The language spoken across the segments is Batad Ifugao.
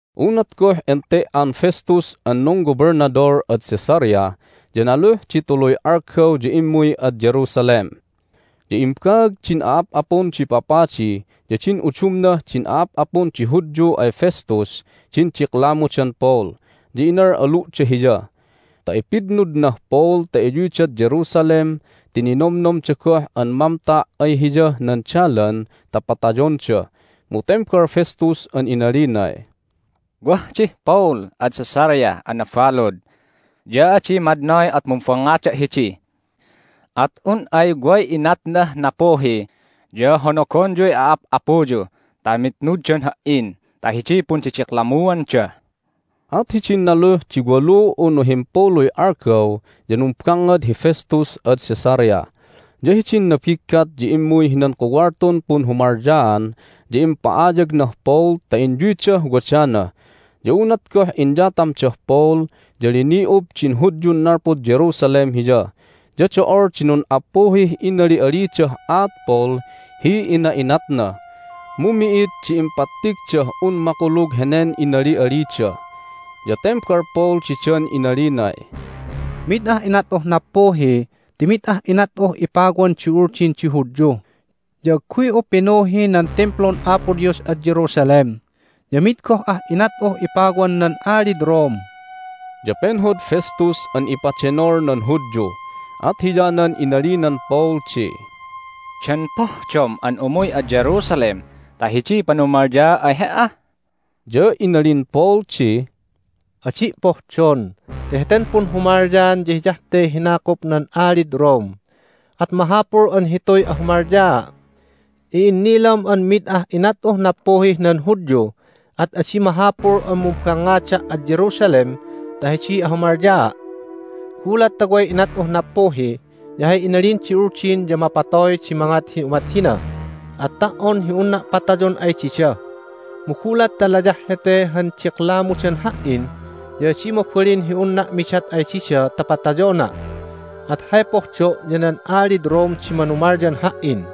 Unat goh ente"an Festus an nunggobelnadol ad Caesarea ya naluh di tuluy algaw ya immuy ad Jerusalem. Ya imbaag din a'ap'apun di papadi ya din udumnah din a'ap'apun di Hudyu ay Festus din diklamudan Paul, ya inal'alu'da hiya ta ipitnudnah Paul ta iyuydad Jerusalem ti ninomnomda goh an mamta' ay hiyah nan dalan ta patayonda. Mu tembal Festus an inalinay, "Wah dih Paul ad Caesarea an nabalud, ya adi madnoy at mumbangngada' hidi. At un ay way inatnah nappuhi ya honogonyuy a'ap'apuyu ta mitnuddan ha"in ta hidiy pundidiklammuanda." At hidin naluh di walu unu himpuluy algaw ya numbangngad hi Festus ad Caesarea. Ya hidin nabiggat ya immuy hinan kuwaltun punhumalyaan, ya impa'ayagnah Paul ta inyuydah wadana. Ya unat goh inyatamdah Paul ya lini'ub din Hudyun nalpud Jerusalem hiya, ya do'ol di nun'appuhih inali'alidah aat Paul hi ina'inatna, mu mi'id di impattigdah un makulug henen inali'alida. Ya tembal Paul didan inalinay, "Mid ah inat'uh nappuhi ti mid ah inat'uh ipawan di Uldin di Hudyu, ya agguy'u pinuhi nan Timplun Apo Dios ad Jerusalem, ya mid goh ah inat'uh ipawan nan Alid Rome!" Ya penhod Festus an ipadenol nan Hudyu, at hiyanan inalinan Paul di, "Dan pohdom an umuy ad Jerusalem ta hidiy panumalyaa' ay he"a?" Ya inalin Paul di, "Adi' pohdon ti heten punhumalyaan ya hiyah te hinakup nan alid Rome, at mahapul an hituy ahumalyaa'. I'innilam an mid ah inat'uh nappuhih nan Hudyu, at adi mahapul an mumbangngada' ad Jerusalem ta hidiy ahumalyaa'. Gulat ta way inat'uh nappuhi ya hay inalin di Uldin ya mapatoy di mangat hi umat hina at ta"on hi unna' patayon ay dida. Mu gulat ta layah hete han diklamudan ha"in ya adi mabalin hi unna' midat ay dida ta patayona'. At hay pohdo' ya nan alid Rome di manumalyan ha"in."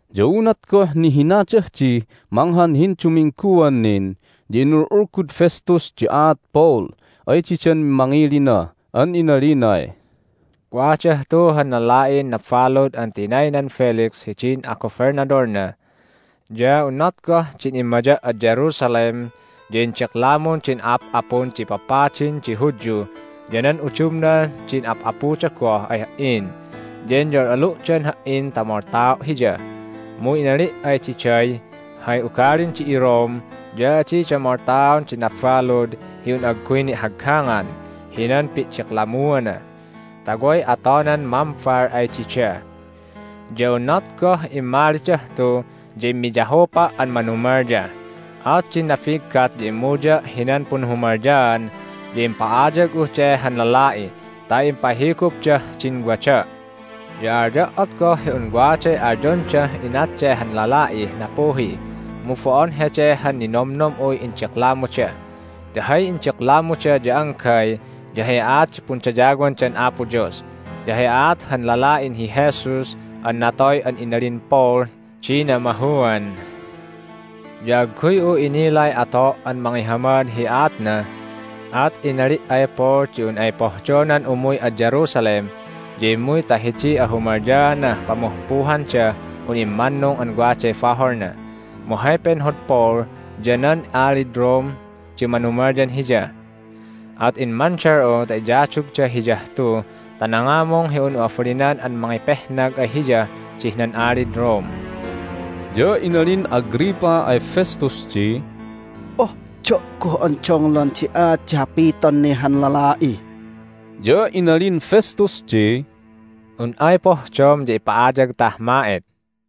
Ya unat goh nihinadah dih manghan hindumingguan nin ya inul'ulgud Festus di aat Paul ay didan mangilina an inalinay, "Wadah tu han lala'in nabalud an tinaynan Felix hidin agobelnadolna. Ya unat goh din immaya' ad Jerusalem ya indiklamun din a'ap'apun di papadin di Hudyu ya nan udumnah din a'ap'apuda goh ay ha"in, ya inyal'alu'dan ha"in ta moltao' hiya. Mu inali' ay diday, Hay ugalin di iRome ya adida moltaon di nabalud hi un agguy ni'haggangan hinan pi'diklammuana, ta way atonan mambal ay dida. Ya unat goh immalidah tu ya immiyahupa' an manumalya. At din nabiggat ya immuya' hinan punhumalyaan, ya impa'ayag'uh de han lala'i ta impahigupdah din wada'. Ya alyo' at goh hi un waday alyondah inat de han lala'ih nappuhi, mu bo'on hede han ninomnom'uy indiklamuda. Ti hay indiklamuda ya anggay ya hay aat di pundayawandan Apo Dios, ya hay aat han lala'in hi Jesus an natoy an inalin Paul di namahuan. Ya agguy'u inilay ato' an mangihamad hi aatna, at inali' ay Paul di un ay pohdonan umuy ad Jerusalem ya immuy ta hidiy ahumalyaanah pamuhpuhandah un immannung an waday baholna. Mu hay penhod Paul ya nan alid Rome di manumalyan hiya. At immandal'u ta iyadugda hiyah tu ta nangamung hi un'u abalinan an mangipehnag ay hiyah dih nan alid Rome." Ya inalin Agrippa ay Festus di, "Pohdo' goh an donglon di aat di hapiton ne han lala'i." Ya inalin Festus di, "Un ay pohdom ya ipa'ayagtah ma'et."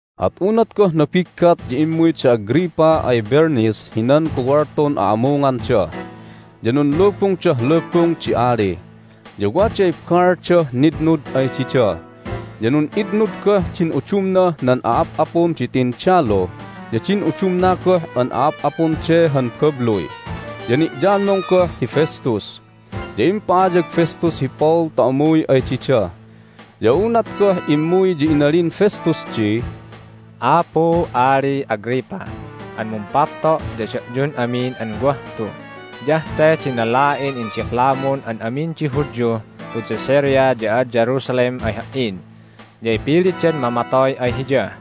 At unat goh nabiggat ya immuy da Agrippa ay Bernice hinan kuwaltun a'amunganda, ya nunlubungdah lubung di ali, ya waday baaldah nitnud ay dida. Ya nun'itnud goh din udumnah nan a'ap'apun di tindalu ya din udumna goh an a'ap'apun de han babluy, ya ni'yamung goh hi Festus. Ya impa'ayag Festus hi Paul ta umuy ay dida. Ya unat goh immuy ya inalin Festus di, "Apu Ali Agrippa an mumpapto' ya da'yun amin an wah tu, hiyah te din lala'in indiklamun an amin di Hudyuh tud Caesarea ya ad Jerusalem ay ha"in. Ya ipilitdan mamatoy ay hiya.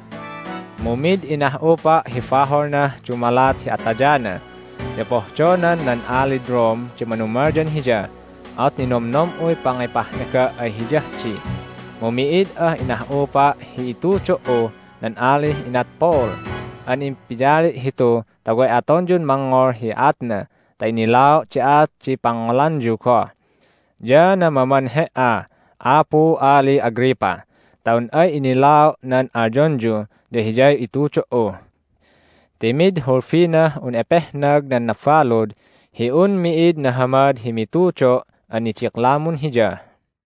Mu mid inah'upa' hi baholnah dumalat hi atayana. Ya pohdonan nan alid Rome di manumalyan hiya, at ninomnom'uy pangipehnaga' ay hiyah di. Mu mi'id ah inah'upa' hi itudo"uh nan alih inat Paul, at impiyali' hitu ta way atonyun mangngol hi aatna ta innilao' di aat di pangngolanyu goh, ya namaman he"a, Apu Ali Agrippa, ta un ay innilao' nan alyonyu ya hiyay itudo"u. Ti mid hulbinah un epehnag nan nabalud hi un mi'id nahamad hi mitudo' an nidiklamun hiya!"